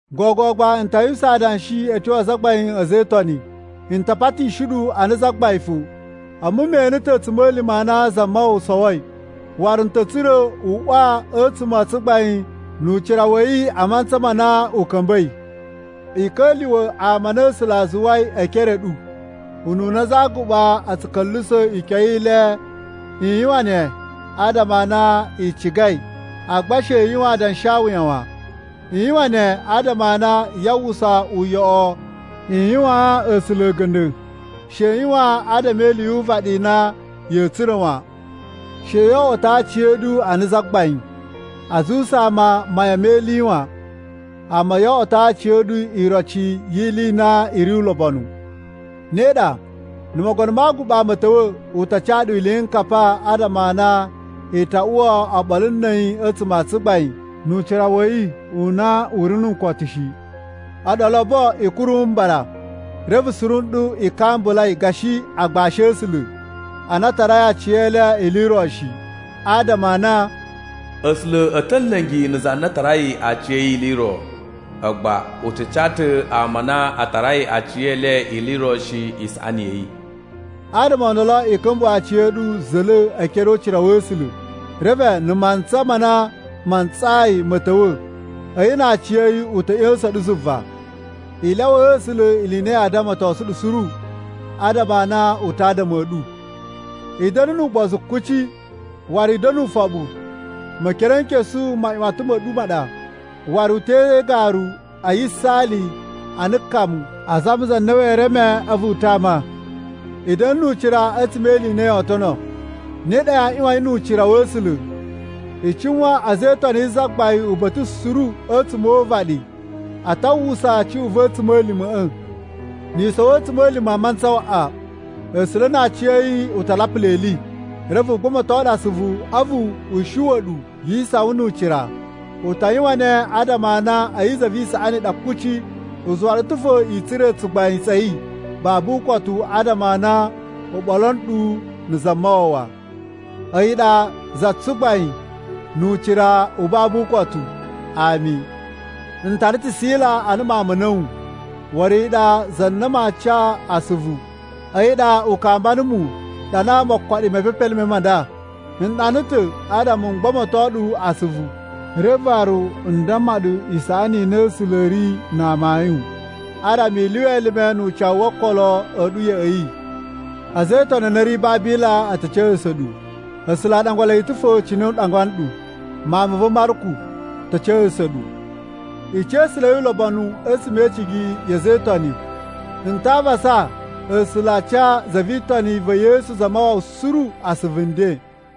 Gogo gba, n ta yuwusan adanshi a̱ tyo a azagbain a̱ a̱za̱ e Itoni. N ta patishi ɗu ana zagbain fo. A̱mu me ene ta̱ a̱tsuma̱lima̱ a na Zamawawa sowoi. Waru n ta̱ tsura̱ n uwa a̱tsuma̱ a tsugbain nu ucira wa̱ yi a mantsa ma na u ka̱mba̱i. I ka̱lyuwa̱ ama a na A̱sula̱ a zuwai e ekere a̱ ɗu, ununa aza a aguɓa a̱ tsu ka̱lyuwusa̱ ikyon i le. I yuwan ne adama a na i cigai, agba she i yuwan adanshawuya wan. I yuwan ne adama a na yaa uwwusa uyoꞌo i yuwaan A̱sula̱ a̱ga̱nda̱. She i yuwan adama e ili yu uvaɗi i na ya̱a̱ tsura̱ wan. She yo oꞌwoto aciya̱ɗu ana zagbain, a zuwusa ama mayan me ili wan, amma yo oꞌwoto aciya̱ɗu iroci yi ili i na i ri ulobonu. Ne ɗa, na̱ Mogono ma Aguɓa ma̱a̱ ta̱wa̱, u ta ca ɗu iliyinkapa adama a na i ta uwa oɓolo na̱ a̱yi a̱tsuma̱ a tsugbain nu ucira wa̱ yi u na u ri nu ukotu shi. A̱ɗu olobo, i kuru mbara. Reve suru nɗu, i kambulai gashi agbashi a̱ A̱sula̱ a na a tarai aciyele ili i ro shi, adama a na, “A̱sula̱ a̱ ta̱ a̱ nla̱ngi na̱ za na tarai aciya̱yi ili i ro, agba u tsu ca ta̱ ama a na a tarai aciyele ili i ro shi isaꞌani ya̱ yi.” Adama o ndolo, i ka̱mbuwa̱ aciya̱ɗu za̱la̱ e ekere o ucira wa̱ A̱sula̱, reve na̱ mantsa ma na ma ntsayi ma̱ ta̱wa̱, a̱yi na aciya̱yi u ta̱ ꞌya̱sa̱n ɗu zuva. I lyawaa A̱sula̱ ili i na yaa damatosun ɗu suru, adama a na u ta adama a̱ ɗu. I da̱na̱ nu ugbozu kuci, waru i da̱na̱ ufoɓu. Mekerenkesu, maꞌyuwatan ma̱ ɗu ma ɗa, waru u te igaru a yisaali ana kamu a zama za na wee reme a̱vu u tama. I da̱na̱ nu ucira a̱tsuma̱ e ili i na yoo tono, ne ɗa yaa ꞌyuwan yi nu ucira wa̱ A̱sula̱. I cuwan a̱za̱ e Itoni yi Zagbain uba̱ta̱ suru a̱tsuma̱ o uvaɗi a ta uwwusa cuꞌun va̱ a̱tsuma̱lima̱ꞌa̱. Ni i sowo a̱tsuma̱lima̱ mantsa waꞌa, A̱sula̱ na aciya̱yi u ta lapula ili, reve u gbamato ɗu asuvu, a̱vu u shuwa̱ ɗu yi isawan nu ucira. U ta yuwan ne adama a na a̱yi za vi isaꞌani i ɗa kuci. U zuwa ɗu ta̱ fo i tsura̱ tsugbain tsa̱ yi babu ukotu adama a na u ɓolo nɗu na̱ Zamawawa. A̱yi ɗa za tsugbain nu ucira u babu ukotu. Ami. N tara ta̱ Sila ana mawun ma̱ a̱na̱wu, waru a̱yi ɗa za na maa ca asuvu. A̱yi ɗa u kamba numu ɗana mokoɗi me mepepelime ma nda. N ɗana ta̱ adama m gbamato ɗu asuvu, reve waru n damma ɗu isaꞌani i na A̱sula̱ a̱ ri na amayun, adama i lyuwa elime nu ucawu wo okolo a̱ ɗu ya̱ꞌa̱ yi. A̱za̱ e Itoni a na a̱ ri Babila a̱ ta̱ ca̱sa̱sa̱ ɗu. A̱sula̱ a ɗangwa le ta̱ fo cine u ɗangwa nɗu. Mawun ma̱ va̱ Marku ta̱ ca̱sa̱sa̱ ɗu. I ca̱sa̱la̱i ulobonu a̱tsuma̱ e icigi ya̱ a̱za̱ e Itoni. N ta avasa A̱sula̱ a ca za vi Itoni va̱ Yesu Zamawawa suru asuvu nden.